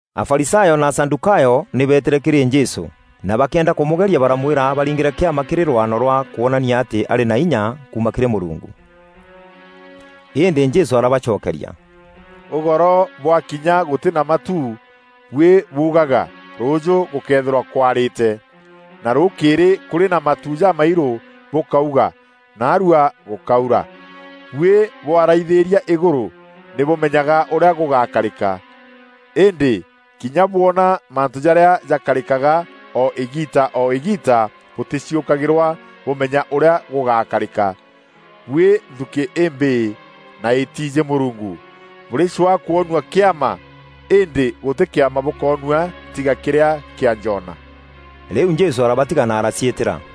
Afarisayo na Asadûkayo nî beetîre kîrî Jesû, na bakîenda kûmûgeria baramwîra abaringîre kîama kîrî rwano rwa kwonania atî arî na inya kuuma kîrî Mûrungu. Îndî Jesû arabacokeria, “Ûgoro bwakinya gûtî na matu, buî buugaga, ‘Rûûjû gûkeethîrwa kwarîte,’ na rûûkîrî kûrî na matu jamairû, bûkauga, ‘Naarua gûkaura.’ Buî bwaraithîria îgûrû, nî bûmenyaga ûrîa gûgakarîka. Îndî kinya bwona mantû jarîa jakarîkaga o îgiita o îgiita, bûtîciûkagîrwa bûmenya ûrîa gûgûkarîka. Buî nthukî îmbîî na îtiijî Mûrungu, bûrîcwaa kwonua kîama, îndî gûtî kîama bûkonua tiga kîrîa kîa Jona.” Rîu Jesû arabatiga na araciîtîra.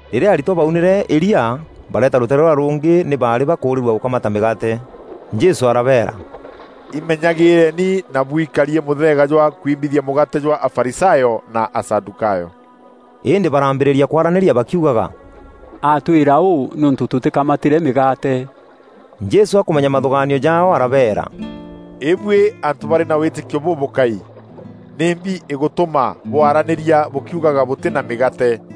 Rîrîa aritwa baunîre îria bareeta rûteere rûrîa rûngî nî baarî bakûrîrua gûkamata mîgaate. Jesû arabeera, “Imenyagîîreeni na buikarie mûtheega jwa kwimbithia mûgaate jwa Afarisayo na Asadûkayo.” Îndî barambîrîria kwaranîria bakiugaga, “Atwîra ûû nîûntû tûtîkamatîre mîgaate.” Jesû akûmenya mathûgaanio jaao arabeera, “Îbuî antû barî na wîtîkio bûbûkai! Nîmbi îgûtûma bwaranîria bûkiugaga bûtî na mîgaate?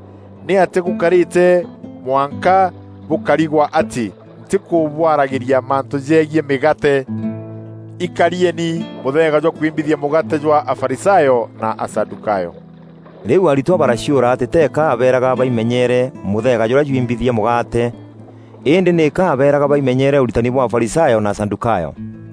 Nîatîa gûkarîte mwanka bûkarigwa atî ntîkûbwaragîria mantû jegiî mîgaate? Ikarieni mûtheega jwa kwimbithia mûgaate jwa Afarisayo na Asadûkayo!” Rîu aritwa baraciûra atî teeka abeeraga baimenyeere mûtheega jûrîa jwimbithia mûgaate, îndî nîka aabeeraga baimenyeere ûritani bwa Afarisayo na Asadûkayo.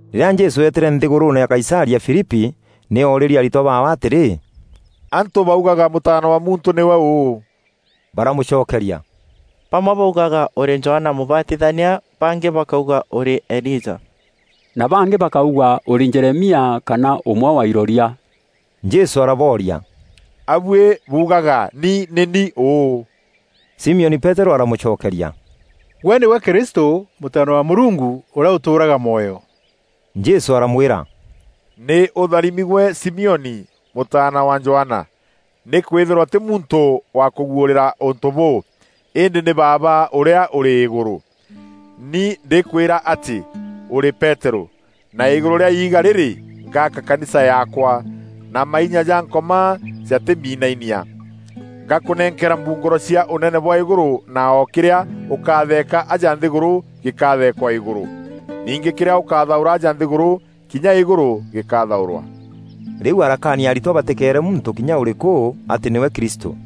Rîrîa Jesû eetîre nthîgûrûûne ya Kaisaria Filipi nî oorîrie aritwa baawe atîrî, “Antû baugaga Mûtaana wa Muntû nîwe ûû?” Baramûcokeria, “Bamwe baugaga ûrî Johana Mûbatithania, bangî bakauga ûrî Elija, na bangî bakauga ûrî Jeremia kana ûmwe wa iroria.” Jesû arabooria, “A buî buugaga ni nî ni ûû?” Simioni Peterû aramûcokeria, “Gwe nîgwe Kristû, Mûtaana wa Mûrungu ûrîa ûtûûraga mwoyo.” Jesû aramwîra, “Nî ûtharimi gwe Simioni, mûtaana wa Johana! Nîkwîthîrwa tî muntû wakûguûrîra ûntû bûû, îndî nî Baaba ûrîa ûrî îgûrû. Ni ndîkwîra atî ûrî Peterû, na îgûrû rîa iiga rîrî, ngaaka kanisa yaakwa; na mainya ja Nkoma jatîminainia. Ngakûnenkera mbungûro cia Ûnene bwa îgûrû na o kîrîa ûkatheeka aja nthîgûrû gîkatheekwa îgûrû. Ningî kîrîa ûkathaûra aja nthîgûrû, kinya îgûrû gîkathaûrwa.” Rîu arakaania aritwa batîkeere muntû kinya ûrîkû atî nîwe Kristû.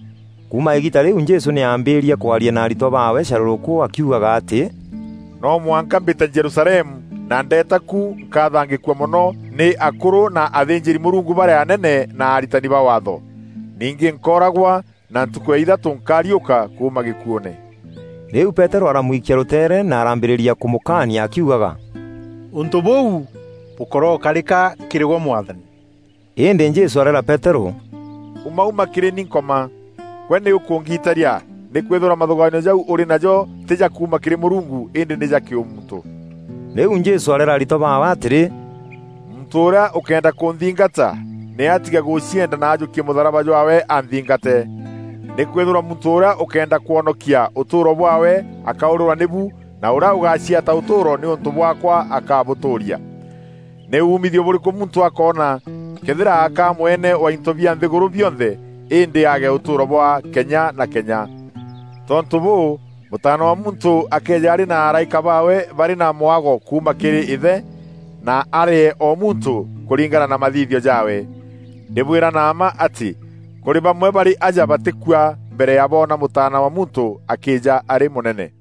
Kuuma îgiita rîu Jesû nî aambîîrie kwaria na aritwa baawe carûrûkû akiugaga atî, “No mwanka mbîte Jerusalemu na ndeeta ku nkathangîkua mono nî akûrû na athînjîri-Mûrungu barîa anene na aritani ba Waatho. Ningî nkooragwa na ntukû ya îthatû nkariûka kuuma gîkuûne.” Rîu Peterû aramwikia rûteere na arambîrîria kûmûkania akiugaga, “Ûntû bûu bûkorokarika kîrî gwe Mwathani!” Îndî Jesû areera Peterû, “Ûmaûma kîrî ni Nkoma! Gwe nî ûkûngitaria nîkwîthîrwa mathûgaanio jau ûrî najo tî ja kuuma kîrî Mûrungu îndî nî ja kîûmuntû.” Rîu Jesû areera aritwa baawe atîrî, “Muntû ûrîa ûkëenda kûnthingata, nî atige gûcienda na ajûkie mûtharaba jwaawe anthingate. Nîkwîthîrwa muntû ûrîa ûkeenda kwonokia ûtûûro bwaawe akaûrîrwa nîbu na ûrîa ûgaciata ûtûûro nîûntû bwaakwa akabûtûûria. Nî umîthio bûrîkû muntû akoona, këethîra akaa mwene wa into bia nthîgûrû bionthe îndî aage ûtûûro bwa kenya na kenya? Tontû bûû, Mûtaana wa Muntû akeeja arî na araîka baawe barî na mwago kuuma kîrî Îthe, na arîee o muntû kûringana na mathithio jaawe. Ndîbwîra na mma atî kûrî bamwe barî aja batîkua mbere ya boona Mûtaana wa Muntû akîîja arî mûnene.”